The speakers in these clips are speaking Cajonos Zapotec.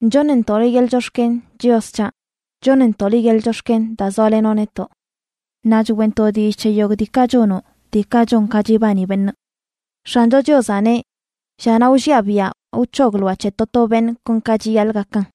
Choṉntoꞌ liꞌ yeḻꞌ chox̱ken, Chios c̱haꞌ. Choṉntoꞌ liꞌ yeḻꞌ chox̱ken daa zoalenoꞌ netoꞌ. Naꞌ choeꞌntoꞌ dillꞌ c̱he yogꞌ diikaꞌ chonoꞌ, diikaꞌ chon ka chibani beṉꞌ. X̱ancho Chiozaꞌ neꞌ: “Llanaꞌ wlliaꞌ biaꞌ, wc̱hogloaꞌ c̱he to to beṉꞌ kon ka chiyaḻꞌ gakan.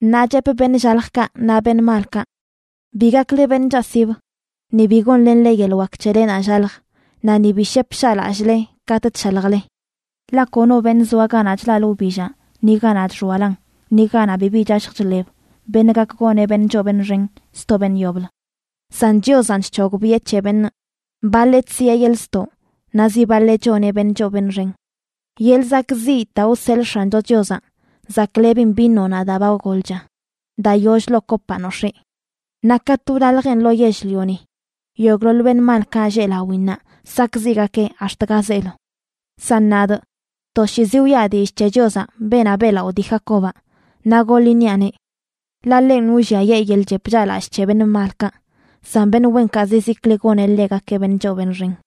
Naꞌ chepꞌ beṉꞌ llaljkaꞌ naꞌ beṉꞌ malkaꞌ: “Bi gakle beṉꞌ chaꞌsib; ni bi gonlenle yeḻꞌ wak c̱helenaꞌ llalj naꞌ ni bi shep shaꞌlallꞌle katꞌ chshaljle.” Ḻaꞌ kono beṉꞌ zoa ganaꞌ chlaꞌlə wbillaꞌ ni ganaꞌ chxoalan, ni ganaꞌ bibi chashj chḻeb, beṉꞌ gak goneꞌ beṉꞌ choo beṉꞌ xen sto beṉꞌ yoblə. San Chiozanꞌ chc̱hogbiꞌe c̱he beṉꞌ: baḻeꞌ chsiꞌe yeḻꞌ ztoꞌ naꞌ zi baḻeꞌ choneꞌ beṉꞌ choo beṉꞌ xen. Yeḻꞌ zakꞌziꞌ daa wseḻꞌ X̱ancho Chiozaꞌ zaklebin vinonaꞌ daa ba golcha, daa yoll ḻoo kopaꞌ nox̱ee. Naꞌ katꞌ wlaljeꞌn lo yell-lioni, yogꞌḻoḻ beṉꞌ malkaꞌ lleꞌ lawinnaꞌ sakꞌziꞌgakeꞌ ax̱t ga zeelo. San nadꞌ, toshiizi wiꞌa dillꞌ c̱he Chiozaꞌ, beenaꞌ beꞌlaꞌo dii Jacobaꞌ, naꞌ goḻ iṉiaꞌneꞌ. Ḻaꞌ ḻenꞌ wlliayee yeḻꞌ chep chaꞌlallꞌ c̱he beṉꞌ malkaꞌ, san beṉꞌ wenkaꞌ zizikli goneꞌ ḻegakeꞌ beṉꞌ choo beṉꞌ xen.